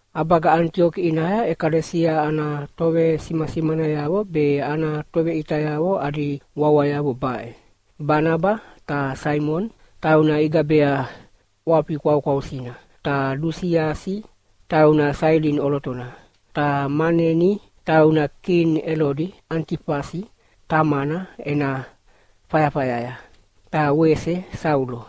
ʼAbaga Anitioki ʼinaya ʼekalesia ana tovesimasimanayavo be ana toveʼitayavo adi wawayavo baʼe: Banaba ta Simioni (tauna igabea ʼWafi Kwaukwausina) ta Lusiasi (tauna Sailini ʼolotona), ta Maneni (tauna kini Elodi Anitifasi tamana ena fayafayaya), ta wese Saulo.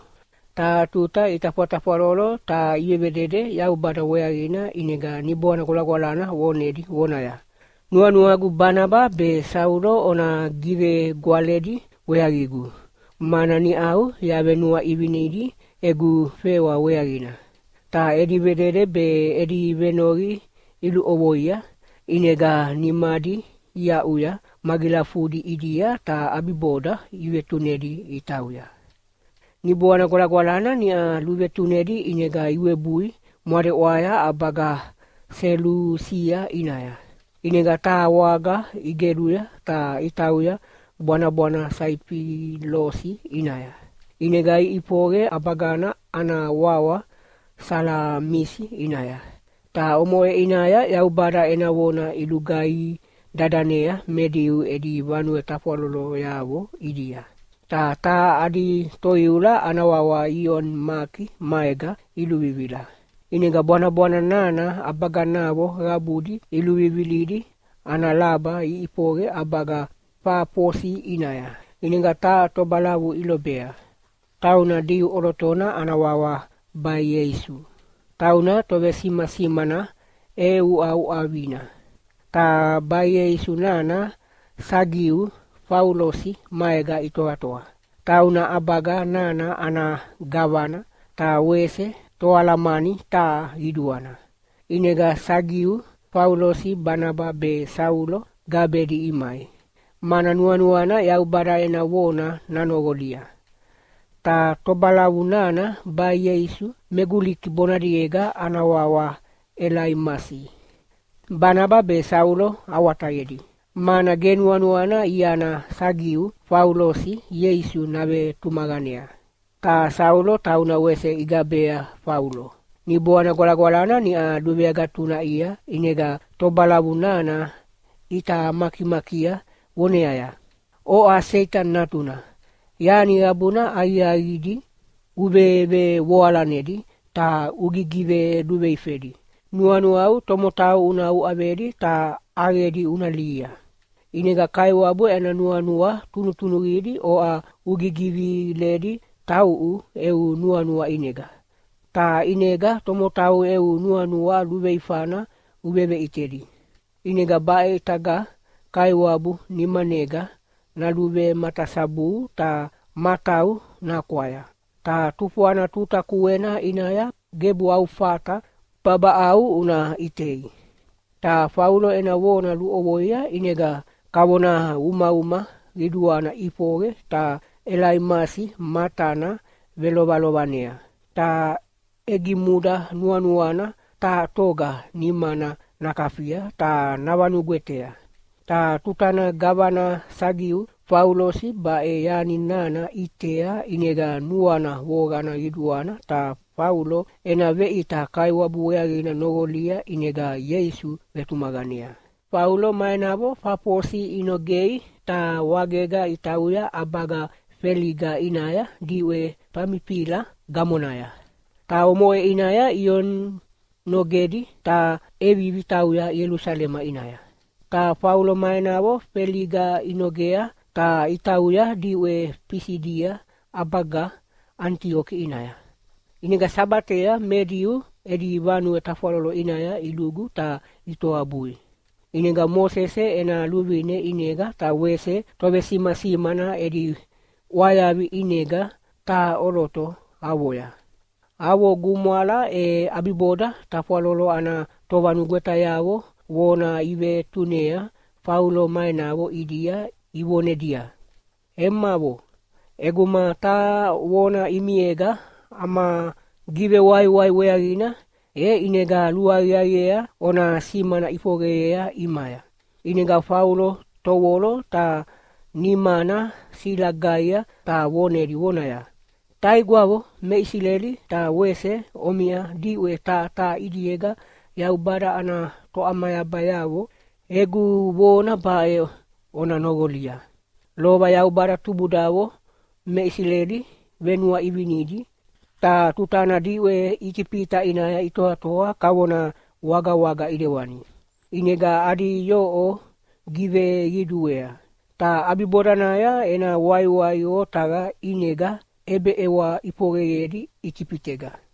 Taha tuta itafwatafwalolo ta ivevedede Yaubada weaqina ʼinega Niboana Gwalagwalana vonedi vonaya, “Nuanuagu Banaba be Saulo ona givegwaledi weaqigu, mana niʼau yavenuaʼivinidi egu fewa weaqina.” Ta edi vedede be edi venoqi iluʼovoia, ʼinega nimadi iaʼuya magilafudi ʼidia ta ʼabiboda ivetunedi itauya. Niboana Gwalagwalana niʼa luvetunedi ʼinega iwebui mwadeʼwaya ʼabaga Selusia ʼinaya. ʼInega taha waga igeluya ta itauya bwanabwana Saifilosi ʼinaya. ʼInega iʼifoqe ʼabaga ana wawa Salamisi ʼinaya, ta omoʼe ʼinaya Yaubada ena vona ilugaihi dadanea me Diu edi vanue tafwaloloyavo ʼidia. Ta taha adi toiula ana wawa Ioni Maki maega iluvivila. ʼInega bwanabwana nana ʼabaganavo qabudi iluvivilidi ana laba iʼifoqe ʼabaga Fafosi ʼinaya. ʼInega taha tobalavu ilobea, tauna Diu ʼolotona ana wawa Baieisu. Tauna tovesimasimana ʼeʼeuʼauʼavina. Ta Baieisu nana Sagiu Faulosi maega itoatoa, tauna ʼabaga nana ana gavana, ta wese toalamani taha qiduana. ʼInega Sagiu Faulosi Banaba be Saulo gabedi imai, mana nuanuana Yaubada ena vona nanoqolia. Ta tobalavu nana Baieisu (me Guliki bonadiega ana wawa Elaimasi) Banaba be Saulo awatayedi, mana ge nuanuana iana Sagiu Faulosi Ieisu navetumaqanea. Ta Saulo, tauna wese igabea Faulo, Niboana Gwalagwalana niʼa luveagatunaʼia ʼinega tobalavu nana ʼita makimakia voneaya, “Oʼa Seitani natuna, yani qabuna aqiaqidi uvevevoalanedi ta ugigiveluveifedi, nuanuau tomotau una uʼavedi ta ʼaqedi una lihia. ʼInega Kaiwabu ena nuanua tunutunuqidi oʼa ugigiviledi tauʼu eu nuanua ʼinega, ta ʼinega tomotau eu nuanua luveifana uveveʼitedi. ʼInega baʼe ʼitaga Kaiwabu nimanega naluvematasabuhu ta matau nakwaya. Ta tufwana tuta kuena ʼinaya gebu au fata babaʼau una ʼitei.” Ta Faulo ena vona luʼovoia ʼinega kavona umauma qiduana ʼifoqe ta Elaimasi matana velovelovanea, ta ʼegimuda nuanuana taha toga nimana nakafia ta navanugwetea. Ta tutana gavana Sagiu Faulosi baʼe yani nana ʼitea ʼinega nuana voqana qiduana ta Faulo ena veʼita Kaiwabu weaqina noqolia ʼinega Ieisu vetumaqanea. Faulo ma enavo Fafosi inogei ta wagega itauya ʼabaga Feliga ʼinaya diʼwe Famifila gamonaya. Ta omoʼe ʼinaya Ioni nogedi ta ʼevivi tauya Ielusalema ʼinaya. Ta Faulo ma enavo Feliga inogea ta itauya diʼwe Fisidia ʼabaga Anitioki ʼinaya. ʼInega Sabatea me Diu edi vanue tafwalolo ʼinaya ilugu ta itoabui. ʼInega Mosese ena luvine ʼinega ta wese tovesimasimana edi ʼwayavi ʼinega taha ʼoloto avoya. Avo gumwala e ʼabiboda tafwalolo ana tovanugwetayavo vona ivetunea Faulo ma enavo ʼidia ivonedia, “Emavo, ʼeguma taha vona ʼimiega ama givewaiwai weaqina, e ʼinega luaqiaqiea ona simana ʼifoqeyea ʼimaya.” ʼInega Faulo tovolo ta nimana silagaia ta vonedi vonaya, “Taigwavo me Isileli ta wese omiʼa diʼwe taha taha ʼidiega Yaubada ana toʼamayabayavo, egu vona baʼe ona noqolia. Lova Yaubada tubudavo me Isileli venuaʼivinedi. Ta tutana diʼwe Itifita ʼinaya itoatoa kavona wagawaga ʼidewani, ʼinega adi yoʼo giveqiduea. Ta ʼabibodanaya ena waiwai otaqa ʼinega ʼebeʼewa ʼifoqeyedi Itifitega.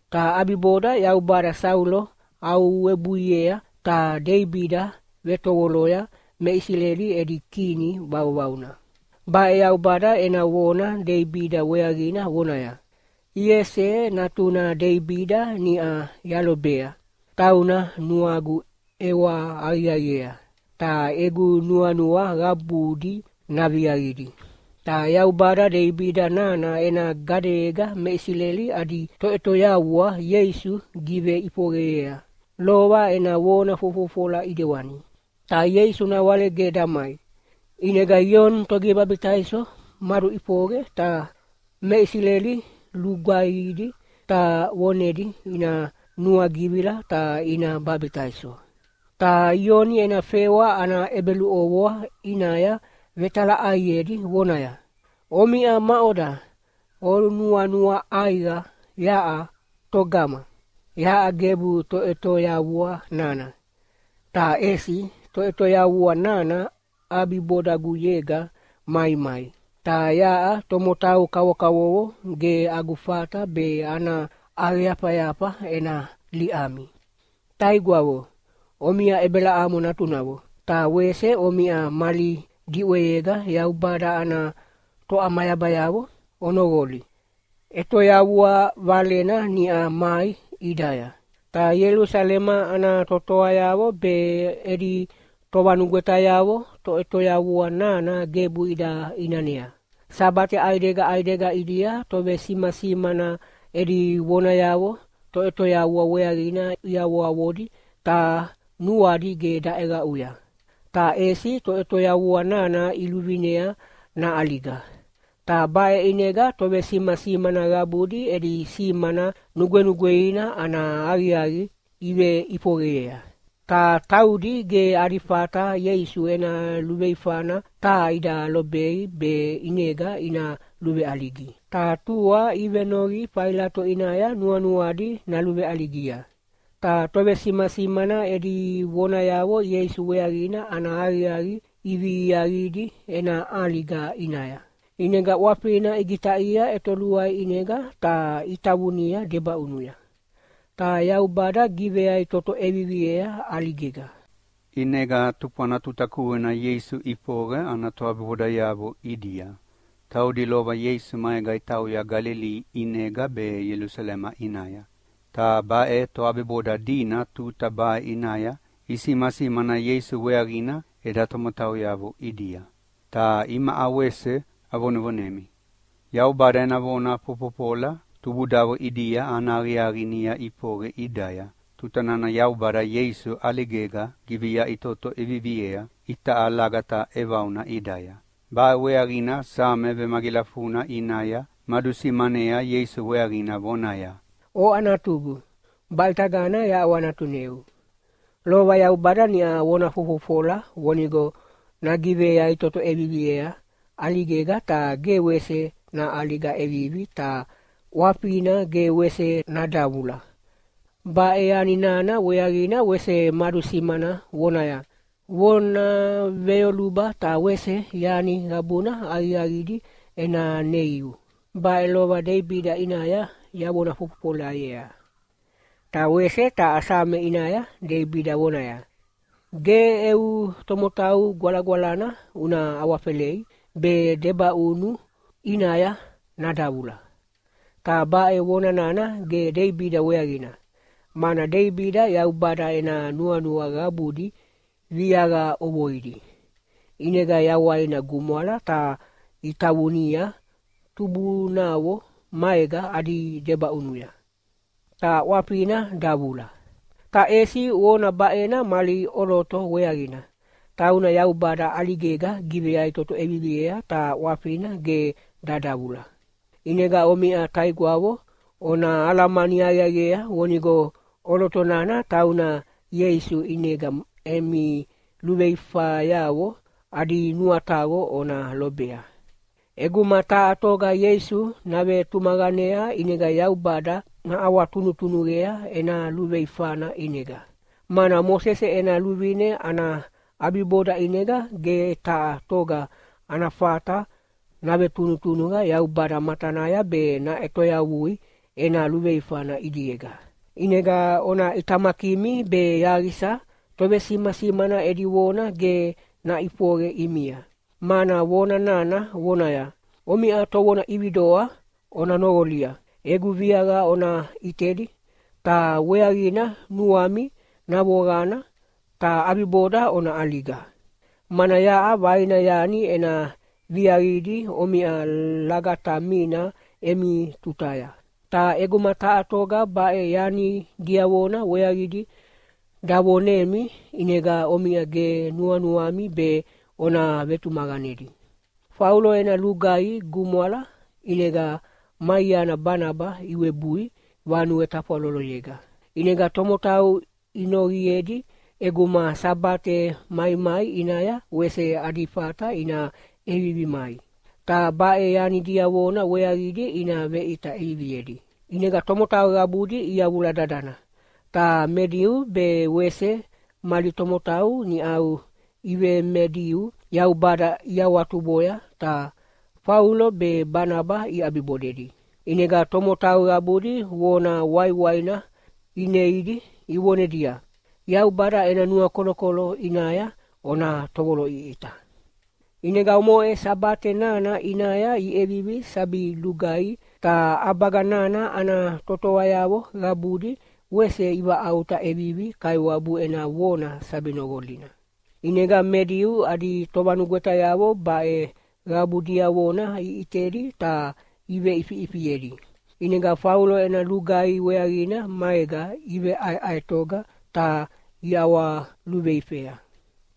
Ta ʼabiboda Yaubada Saulo aʼuwebuiea ta Deibida vetovoloya me Isileli edi kini vauvauna. Baʼe Yaubada ena vona Deibida weaqina vonaya, ‘Iese natuna Deibida niʼa yalobea, tauna nuagu ʼewa aqiaqiea, ta egu nuanua qabudi naviaqidi.’ Ta Yaubada Deibida nana ena gadeyega me Isileli adi Toʼetoyavua Ieisu giveʼifoqeyea, lova ena vona fofofola ʼidewani. Ta Ieisu nawale ge damai, ʼinega Ioni Togivebabitaiso maduʼifoqe ta me Isileli lugaihidi ta vonedi ina nuagivila ta ina babitaiso. Ta Ioni ena fewa ana ʼebeluʼovoa ʼinaya vetalaʼaiedi vonaya, ‘Omiʼa maʼoda onuanua ʼaiqa yaʼa togama? Yaʼa gebu Toʼetoyavua nana. Ta ʼesi Toʼetoyavua nana ʼabibodaguyega maimai, ta yaʼa tomotau kavokavovo ge agu fata be ana ʼaqeyafayafa ena liʼami.’ “Taigwavo, omiʼa Ebelamo natunavo, ta wese omiʼa mali diʼweyega Yaubada ana toʼamayabayavo, onoqoli! ʼEtoyavua valena niʼa mai ʼidaya. Ta Ielusalema ana totoayavo be edi tovanugwetayavo Toʼetoyavua nana gebu ida ʼinanea. Sabate ʼaidega ʼaidega ʼidia tovesimasimana edi vonayavo Toʼetoyavua weaqina iavoavodi ta nuadi ge daʼeqaʼuya. Ta ʼesi Toʼetoyavua nana iluvinea naʼaliga, ta baʼe ʼinega tovesimasimana qabudi edi simana nugwenugweina ana aqiaqi iveʼifoqeyea. Ta taudi ge adi fata Ieisu ena luveifana taha ida lobei be ʼinega ina luveʼaligi, ta tua ivenoqi Failato ʼinaya nuanuadi naluveʼaligia. “Ta tovesimasimana edi vonayavo Ieisu weaqina ana aqiaqi iviaqidi ena ʼaliga ʼinaya. ʼInega ʼwafina igitaʼia ʼetoluai ʼinega ta itavunia debaʼunuya. Ta Yaubada giveyaʼitoto ʼeviviea ʼaligega. ʼInega tufwana tuta kuena Ieisu ʼifoqe ana toʼabibodayavo ʼidia, taudi lova Ieisu maega itauya Galili ʼinega be Ielusalema ʼinaya. Ta baʼe toʼabiboda dina tuta baʼe ʼinaya isimasimana Ieisu weaqina eda tomotauyavo ʼidia. Ta imaʼa wese avonevonemi. Yaubada ena vona fofofola tubudavo ʼidia ana aqiaqi niʼa ʼifoqe ʼidaya tuta nana Yaubada Ieisu ʼaligega giveyaʼitoto ʼeviviea itaʼa lagata ʼevauna ʼidaya. Baʼe weaqina Same vemagilafuna ʼinaya madusimanea Ieisu weaqina vonaya, ‘Oʼa Natugu, baʼitagana yaʼawanatuneu.’ Lova Yaubada niʼa vona fofofola vonigo nagiveyaʼitoto ʼeviviea ʼaligega ta ge wese naʼaliga ʼevivi ta ʼwafina ge wese nadavula. Baʼe yani nana weaqina wese madusimana vonaya, ‘Vona veyoluba ta wese yani qabuna aqiaqidi ena neiu. Baʼe lova Deibida ʼinaya yavona fofofolayea.’ Ta wese taha Same ʼinaya Deibida vonaya, ‘Ge eu Tomotau Gwalagwalana una awafelei be debaʼunu ʼinaya nadavula.’ “Ta baʼe vona nana ge Deibida weaqina, mana Deibida Yaubada ena nuanua qabudi viaqa ʼovoidi, ʼinega yawaina gumwala ta itavunia tubunavo maega adi debaʼunuya, ta ʼwafina davula. Ta ʼesi vona baʼena mali ʼoloto weaqina, tauna Yaubada ʼaligega giveyaʼitoto ʼeviviea ta ʼwafina ge dadavula. ʼInega omiʼa taigwavo, ona alamani aqiaqiea vonigo ʼoloto nana tauna Ieisu ʼinega emi luveifayavo adi nuataqo ona lobea. ʼEguma taha toga Ieisu navetumaqanea ʼinega Yaubada naʼawatunutunuqea ena luveifana ʼinega, mana Mosese ena luvine ana ʼabiboda ʼinega ge taha toga ana fata navetunutunuqa Yaubada matanaya be naʼetoyavui ena luveifana ʼidiega. ʼInega ona ʼitamakimi be yaqisa tovesimasimana edi vona ge naʼifoqe ʼimia, mana vona nana vonaya, ‘Omiʼa tovona ʼividoa, ona noqolia! Egu viaqa ona ʼitedi ta weaqina nuami navoqana, ta ʼabiboda ona ʼaliga. Mana yaʼa vaina yani ena viaqidi omiʼa lagatamina emi tutaya, ta ʼeguma taha toga baʼe yani diavona weaqidi davonemi ʼinega omiʼa ge nuanuami be ona vetumaqanedi.’” Faulo ena lugaihi gumwala ʼinega ma iana Banaba iwebui vanue tafwaloloyega, ʼinega tomotau inoqiedi ʼeguma Sabate maimai ʼinaya wese adi fata ina ʼevivi mai, ta baʼe yani diavona weaqidi ina veʼita ʼeviviedi. ʼInega tomotau qabudi iyavula dadana, ta me Diu be wese mali tomotau niʼau iveme-Diu Yaubada iawahawatuboya ta Faulo be Banaba iʼabibodedi. ʼInega tomotau qabudi vona waiwaina ineidi ivonedia, “Yaubada ena nuakolokolo ʼinaya ona tovoloʼiʼita.” ʼInega omoʼe Sabate nana ʼinaya iʼevivi sabi lugaihi ta ʼabaga nana ana totoayavo qabudi wese ivaʼauta ʼevivi Kaiwabu ena vona sabi noqolina. ʼInega me Diu adi tovanugwetayavo baʼe qabu diavona iʼitedi ta iveʼifiʼifiedi, ʼinega Faulo ena lugaihi weaqina maega iveʼaeʼaetoga ta iʼawaluveifea.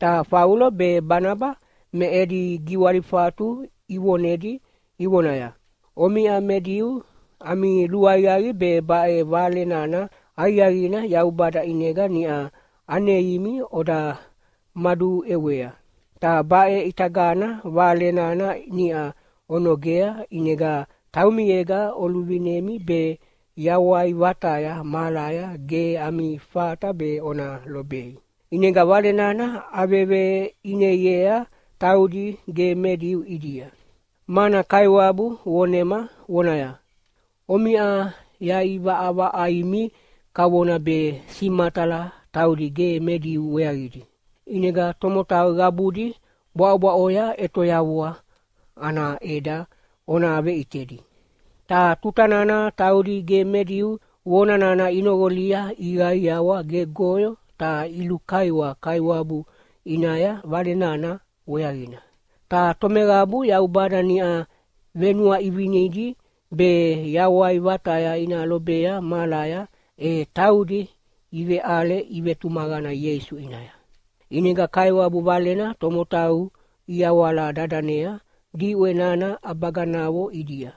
Ta Faulo be Banaba me edi giwalifatu ivonedi ivonaya, “Omiʼa me Diu ami luaqiaqi be baʼe Vale nana Aqiaqina Yaubada ʼinega niʼa aneimi oda maduʼewea. Ta baʼe ʼitagana Vale nana niʼa onogea ʼinega taumiega oluvinemi be yawai vataya mahalaya ge ami fata be ona lobei. ʼInega Vale nana aveveʼineiea taudi ge me Diu ʼidia. Mana Kaiwabu vonema vonaya, ‘Omiʼa yaʼivaʼavaʼaimi kavona be simatala taudi ge me Diu weaqidi. ʼInega tomotau qabudi bwaʼobwaʼoya ʼetoyavua ana ʼeda ona veʼitedi.’” Ta tuta nana taudi ge me Diu vona nana inoqolia iqaiawa gegoyo ta ilukaiwa Kaiwabu ʼinaya Vale nana weaqina. Ta tomeqabu Yaubada niʼa venuaʼivinedi be yawai vataya ina lobea mahalaya, e taudi iveʼale ivetumaqana Ieisu ʼinaya. ʼInega Kaiwabu Valena tomotau iyawala dadanea diʼwe nana ʼabaganavo ʼidia.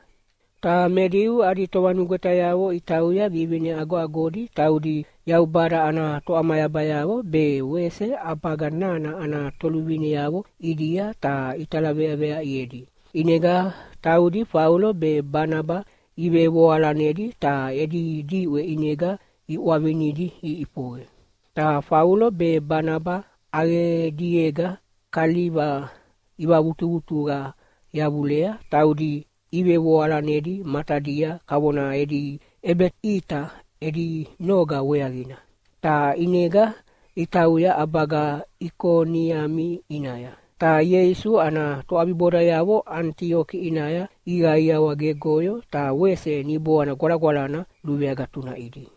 Ta me Diu adi tovanugwetayavo itauya vivine agoagodi taudi Yaubada ana toʼamayabayavo be wese ʼabaga nana ana toluvineavo ʼidia ta italaveaveaʼiedi. ʼInega taudi Faulo be Banaba ivevoalanedi ta edi diʼwe ʼinega iʼwavinidi iʼifoqe. Ta Faulo be Banaba ʼaqediega kaliva ivavutuvutuqa yavulea taudi ivevoalanedi matadia kavona edi ʼebeʼita edi noga weaqina. Ta ʼinega itauya ʼabaga Ikoniami ʼinaya. Ta Ieisu ana toʼabibodayavo Anitioki ʼinaya iqaiawa gegoyo ta wese Niboana Gwalagwalana luveagatunaʼidi.